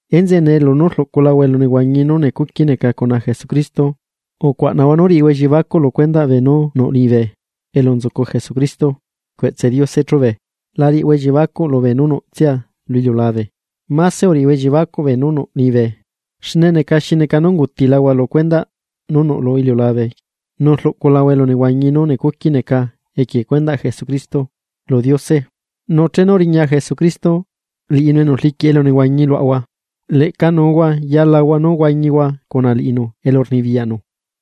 Enzeꞌe nee lunú rluꞌculahua elunehuañi nú necuqui neca cuna Jesucristo, ucuaꞌnahua nú riꞌihua elliebacuꞌ lu cuendaꞌ beenú nuꞌ liñibe elu nzucu Jesucrito cueꞌtse Diose chube. La riꞌihua elliebacuꞌ beenú nuꞌtsia lu iliulabe, máse uriꞌihua elliebacuꞌ beenú nuꞌ liñibe, xne neca xi neca nú ungutilahua lu cuendaꞌ nú nuꞌ lu iliulabe nu rluꞌculahua elu nehuañi nú necuqui neca equie cuendaꞌ Jesucristo, lu Diose. Nu chenu riña Jesucristo, liꞌinu enu rliquiꞌ elunehuañi luaꞌahua, leꞌca nuhua yalahua nú huañihua cuna liꞌinu elurnibiyaꞌnu.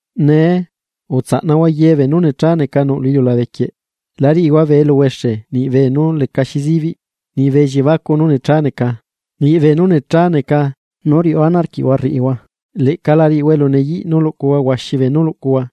Nee, utsanaꞌhua ye beenú necha neca nuꞌ lu iliulabe quieꞌ. La riꞌihua bee eluhuexe niꞌ beenú lecaxi zibiꞌ, niꞌ bee elliebacuꞌ nú necha neca, niꞌ beenú necha neca nú riuꞌu ana arquiꞌhua rriꞌihua, leꞌca la cuaꞌnahua nú riꞌihua elu neyiꞌ nú luꞌcuhua huaxi beenú luꞌcuhua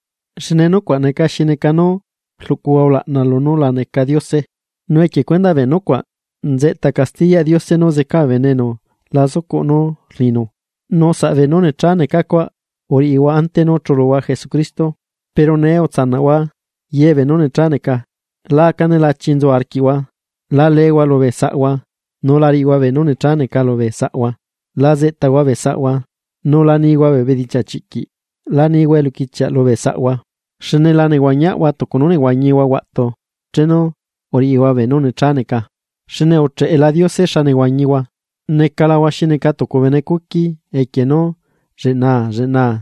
xne nucuaꞌ neca xi neca nú rluꞌcuhua ulaꞌna lunú la neca Diose. Nu equie cuendaꞌ bee nucuaꞌ nzeꞌta castiyaꞌ Diose nú zeca bee bene enu la zucuꞌ nú rninu, nu saꞌ beenú necha neca cuaꞌ uriꞌihua ante nú chuluhua Jesucristo. Pero nee utsanaꞌhua ye beenú necha neca. La aca nelachi nzu arquiꞌhua, la leehua lubee saꞌhua, nu la riꞌihua beenú necha neca lubee saꞌhua, la zeꞌtahua bee saꞌhua, nu la nihua bee bedichiaꞌ chiꞌquiꞌ. La nihua eluquichiaꞌ lubee saꞌhua, xne la nehuañiaꞌhua tucu nú uhuañihua huaꞌtu chenu uriꞌihua beenú necha neca. Xne ucheꞌela Diose xa nehuañihua, necalahua xi neca tucu bene cuqui equie nú lleꞌnaa lleꞌnaa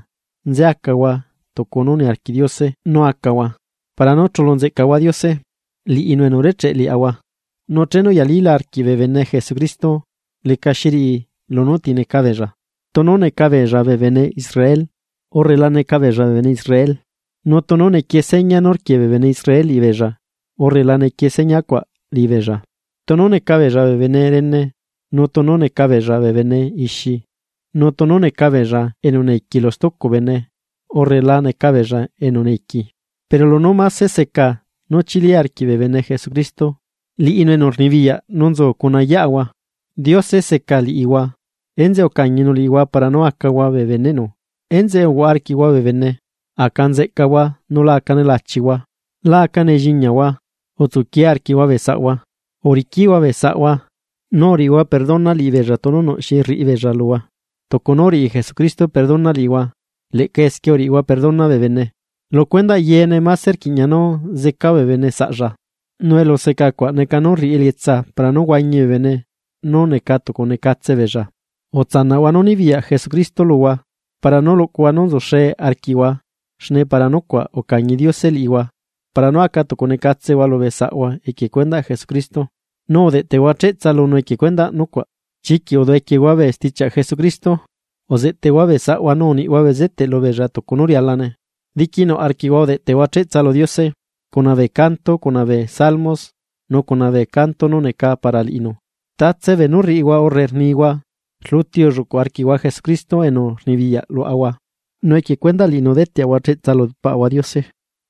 nze acahua tucu nú niarquiꞌ Diose nú acahua para nú chulu nzeꞌcahua Diose, liꞌinu enu urecheꞌ liaꞌahua. Nu chenu uyalila arquiꞌ bee bene Jesucristo lecaxi riꞌi lunú ti neca beella, tunu neca beella bee bene Israel urre la neca beella bee bene Israel nu tunu nequiee seña nú rquiee bee bene Israel liꞌibeella, urre la nequiee seña cuaꞌ liꞌibeella, tunu necabeella bee bene rene nu tunu necabeella bene ixi nu tunu necabeella enu neiqui lu stucu bene urre la necabeella enu neiqui. Pero lunú máse seca nú chili arquiꞌ bee bene Jesucristo, liꞌinu enu rnibiyaꞌ nu nzu cuna yeꞌahua. Diose seca liꞌihua, enzeꞌe ucañinu liꞌihua para nú acahua bee beneꞌnu. Enzeꞌe uhuaꞌa arquiꞌhua bee bene, aca nzeꞌcahua nu la aca nelachihua. La aca nelliñahua, utsuquie arquiꞌhua bee saꞌahua. Uriquiꞌhua bee saꞌhua, nu uriꞌihua perdona liꞌibeella tunu nuꞌ xi rriꞌibeella luhua. Tucu nú uriꞌi Jesucristo perdona liꞌihua leꞌca esquie uriꞌihua perdona bee bene. Lu cuendaꞌ yeene máse rquiꞌña nú seca bee bene saꞌlla. Nu eluseca cuaꞌ neca nú rriꞌi elietsa para nú huañi bee bene nú neca tucu necatse beella. Utsanaꞌhua nú nibiyaꞌ Jesucristo luhua para nú luꞌcuhua nú nzuxe arquiꞌhua xne para nucuaꞌ ucañi Diose liꞌihua para nú aca tucu necatsehua lubee saꞌhua equie cuendaꞌ Jesucristo, nu udeꞌtehua cheꞌtsa lunu equie cuendaꞌ nucuaꞌ. Chiquiꞌ uduꞌequiehua bee stichiaꞌ Jesucristo. Uzeꞌteꞌhua bee saꞌhua nu uniꞌhua bezeteꞌ lubeella tucu nú rialane. Diquinuꞌ arquiꞌhua udeꞌteꞌhua cheꞌtsa lu Diose, cuna bee canto cuna bee salmos nú cuna bee canto nú neca para liꞌinu. Ye beenú rriꞌihua urre rnihua, rluti ulluꞌcu arquiꞌhua Jesucristo enu rnibiyaꞌ luaꞌahua nu equie cuendaꞌ liꞌinu deteꞌahua cheꞌtsa lu Paꞌahua Diose.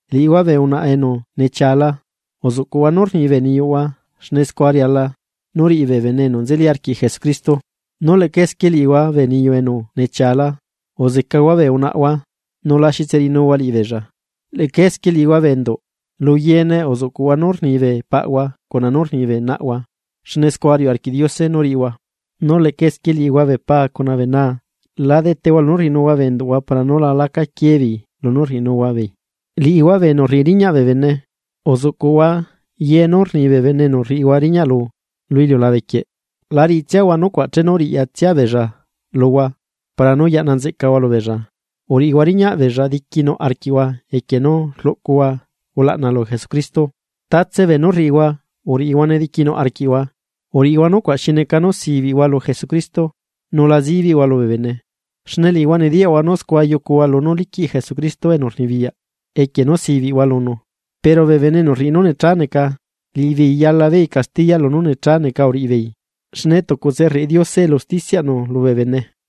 Liꞌihua bee unaꞌa enu nechiala, uzuꞌcuꞌhua nú rni bee niyuꞌhua xne scua riala nú riꞌi bee bene enu nzeli arquiꞌ Jesucristo. Nu leꞌca esquie liꞌihua bee niyu enu nechiala, uzecahua bee unaꞌahua nu la xitse riꞌinuhua liꞌibeella. Leꞌca esquie liꞌihua bee enduꞌ, lu yeene uzuꞌcuꞌhua nú rni bee paꞌahua cuna nú rni bee naꞌhua, xne scua riuꞌ arquiꞌ Diose nú riꞌihua. Nu leꞌca esquie liꞌihua bee paa cuna bee naa, la detehua lunú rriꞌinuhua bee enduꞌhua para nú la laca quieebeei lunú rriꞌinuhua beei. Liꞌihua bee enu rriꞌi riñaꞌ bee bene, uzuꞌcuꞌhua ye nú rni bee bene enu rriꞌihua riñaꞌlu lu iliulabequieꞌ. La riꞌitsiahua nucuaꞌ chenu riꞌyatsia beella luhua para nú yaꞌna nzeꞌcahua lubeella, uriꞌihua riñaꞌbeella diquinuꞌ arquiꞌhua equie nú rlucuhua ulaꞌna lu Jesucristo. Tatse beenú riꞌihua, uriꞌihuane diquinuꞌ arquiꞌhua. Uriꞌihua nucuaꞌ xi neca nú sibiꞌhua lu Jesucristo, nu la zibiꞌhua lubee bene. Xne liꞌihua nediyaꞌhua nú scua yucuhua lunú liquiꞌ Jesucristo enu rnibiyaꞌ, equie nú sibiꞌhua lunu. Pero bee bene enu rriꞌi nú necha neca, liꞌibeei yalabeei castiya lunú necha neca uriꞌibeei, xne tucutse rriꞌi Diose elu usticiaꞌnu lubee bene.